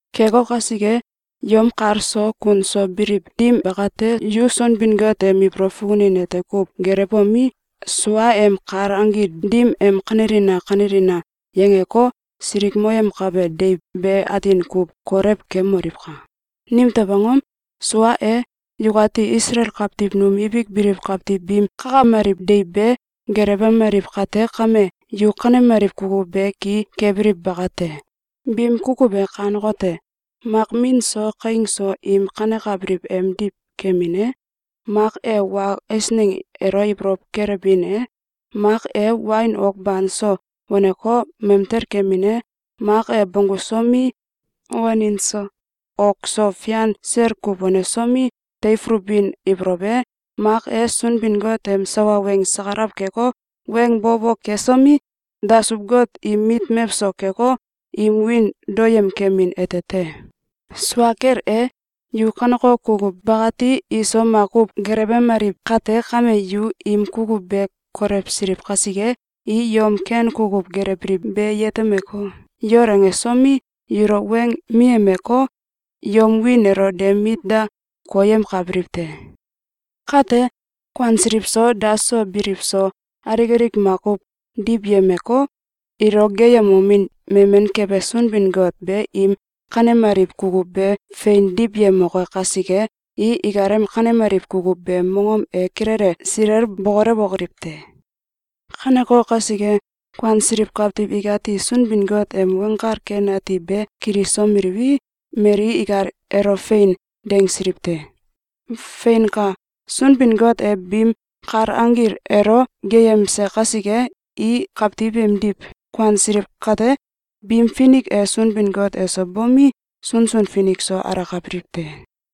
Keko kasike, yom kal so kun so biliw dim bakate, yu Sunbin-Got em ibolow fukunin ete kuw gelewbomi, suaem kal anggil dim em “Kanelina! Kanelina!”, yangeko, silikmoyemkabe deiw be atin kuw kolew kemoliwka! Nimtew angom? Sua e, yukati Isalael kawtiw num ibik biliw kawtiw biim kakameliw deiw be gelewemaliw kate kame, yu kanemaliw kukuw be ki kebiliw bakate. Biim kukuw e kanekote: Mak min so kaing so im kanekabiliw emdiw kemin e, mak e wa eisneng elo ibolow kelewbin e, mak e wain ok banso waneko, mamtel kemin e, mak e bonggusomi, wanin so ok so fian sel kuw wansomi, teifulubin ibolow e, mak e, Sunbin-Got em sawa weng sakalaw keko, weng bo bo kesomi, dasuw god im mit mewso keko, im wiin daoyem kemin ete te. Sua kel e, yu kaneko kukuw bakati iso makuw gelewemaliw kate kame, yu im kukuw be kolewsiliw kasike, i yom ken kukuw gelewbiliw be yetemeko, yol angesomi, yulo weng miyemeko, yom wiin elo de mit da koyemkabiliw te. Kate, kuansiliw so, daso biliw so, alik alik makuw diwyemeko, ilo geeyemomin memen kebe Sunbin-Got be im kanemaliw kukuw be fein diwyemoke kasike, i ikalem kanemaliw kukuw beem mongom e kilele silel bokolewokoliw te. Kaneko kasike, kuansiliw kawtiw ikati Sunbin-Got em Weng Kal Ken Ati be kilisomeliwi, mali ikal elo “Fein!”, dangsiliw te. Feinka! Sunbin-Got e biim kal anggil elo geeyemse kasike, i kawtiw imdiw kuansiliw kate, biim finik e Sunbin-Got eso bomi, sunsun finik so alakabiliw te.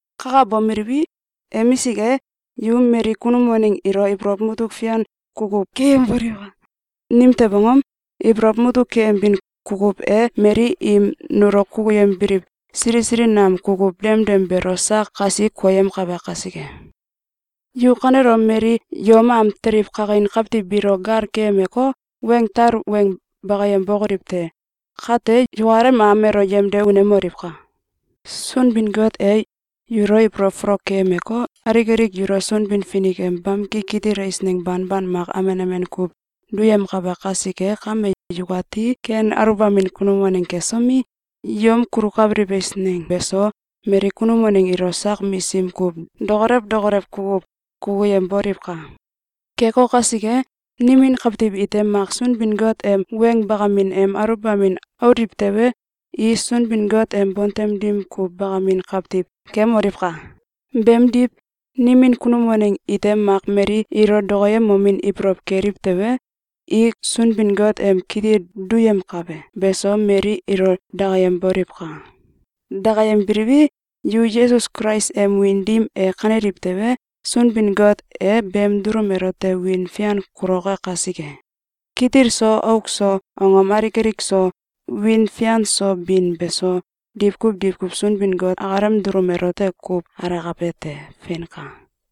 Kakabomeliwi, emisik e, yu mali kunum waneng ilo ibolow mutuk fian kukuw keyemboliwka! Nimtew angom? Ibolow mutuk keyembin kukuw e mali im nulo kukuyembiliw sili sili nam kukuw demdem beelo sak kasi koyemkabe kasike. Yu kanelom mali yom am teliw kakin kawtiw biilo gal keyemko, weng tal weng bakayem bokoliw te! Kate yukalem am elo yemde unemoliwka! Sunbin-Got e yulo ibolow folok keyemeko, alik alik yulo Sunbin-Finik em bamki kitil eisneng banban mak amen amen kuw duyemkabe kasike kame, yukati ken aluwbamin kunum waneng kesomi, yom kulukabiliw eisneng beso mali kunum waneng ilo sak misim kuw dokolew dokolew kukuw kukuyemboliwka! Keko kasike, nimin kawtiw ite mak Sunbin-Got em weng bakamin em aluwbamin auliw tewe, i Sunbin-Got em bontem dim kuw bakamin kawtiw kemoliwka! Beemdiw, nimin kunum waneng ite mak mali ilo dokoyemomin ibolow keliw tewe, i Sunbin-Got em kitil duyemkabe beso mali ilo dakayemboliwka! Dakayembeliwi, yu Yesus Kulais em wiin dim e kaneliw tewe, Sunbin-Got e beem dulum elote wiin fian kuloke kasike. Kitil so auk so, angom alik alik so, wiin fian so bin beso, diwkuw diwkuw Sunbin-Got akalem dulum elote kuw alakabe te. Feinka!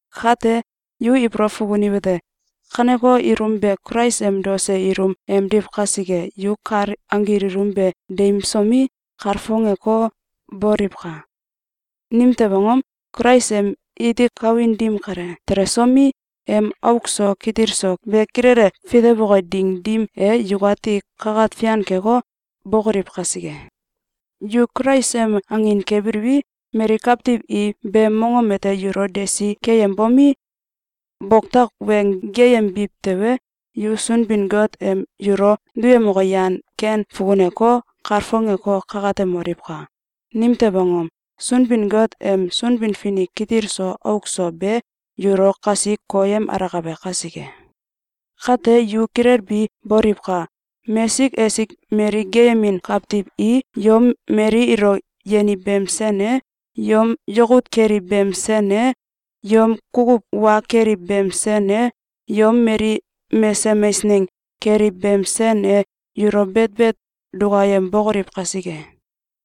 Kate yu ibolow fukuniwete: Kaneko ilum be Kulais em daose ilum emdiw kasike, yu kal anggil ilum be deimsomi, kalfongeko, boliwka! Nimtew angom? Kulais em iti kawin dim kale telesomelei, em auk so kitil so be kilele fitewoke ding dim e, yukati kakat fian keko, bokoliw kasike. Yu Kulais em angin kebiliwi, mali kawtiw i beem mongom ete yulo desi keyembomi, boktak weng geeyembiw tewe, yu Sunbin-Got em yulo duyemoke yan ken fukuneko, kalfongeko, kakatemoliwka! Nimtew angom? Sunbin-Got em Sunbin-Finik kitil so auk so be yulo kasi koyem alakabe kasike. Kate yu kilelbi boliwka! Mesik esik mali geeyemin kawtiw i yom mali ilo yeniw beem sen e, yom yakut keliw beem sen e, yom kukuw wa keliw beem sen e, yom mali mesem eisneng keliw beem sen e yulo betbet dukayembokoliw kasike.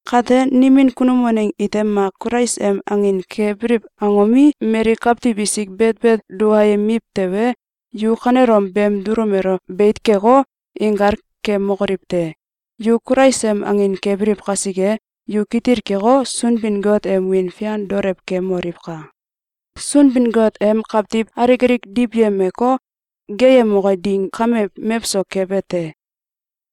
Kate nimin kunum waneng ite mak Kulais em angin kebiliw angomi, mali kawtiw isik betbet dukayemiw tewe, yu kanelom beem dulum elo beit keko, inkal kemokoliw te! Yu Kulais em angin kebiliw kasike, yu kitil keko, Sunbin-Got em wiin fian daolew kemoliwka! Sunbin-Got em kawtiw alik alik diwyemeko, geeyemoke ding kame mewso kebe te.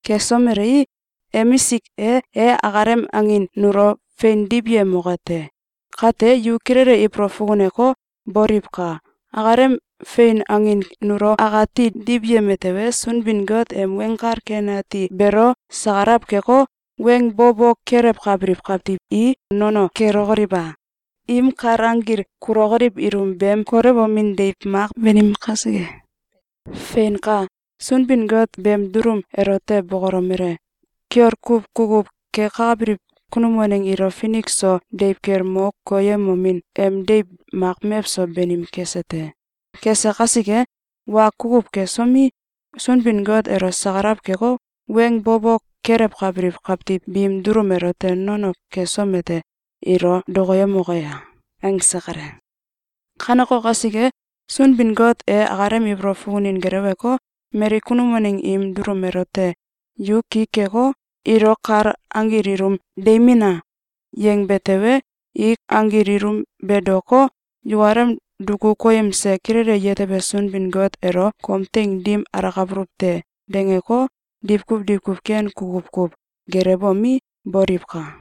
Kesomelei, emisik e, e akalem angin nulo fein diwyemoke te. Kate yu kilele ibolow fukuneko, boliwka! Akalem fein angin nulo akati diwyeme tewe, Sunbin-Got em Weng Kal Ken Ati beelo sakalaw keko, weng bo bo kelewkabiliw kawtiw i nono kelokoliw a? Im kal anggil kulokoliw ilum beem kolewomin deiw mak banim kasike. Feinka! Sunbin-Got beem dulum elote bokolomele: “Kiol kuw kukuw kekabiliw kunum waneng ilo finik so deiw kel mo koyemomin em deiw mak mewso banim kese te. Kese kasike, wa kukuw kesomi, Sunbin-Got elo sakalaw keko, weng bo bo kelewkabiliw kawtiw biim dulum elote nono kesom ete, ilo dokoyemoke ya?”, angse kale. Kaneko kasike, Sunbin-Got e akalem ibolow fukunin geleweko, mali kunum waneng im dulum elote “Yu ki keko, ilo kal anggil ilum deimina!”, yangbe tewe, i anggil ilum be daoko, yukalem duku koyemse kilele yetebe Sunbin-Got elo “Kom teing dim alakabuluw te!”, dangeko, diwkuw diwkuw ken kukuw kuw gelewbomi, boliwka!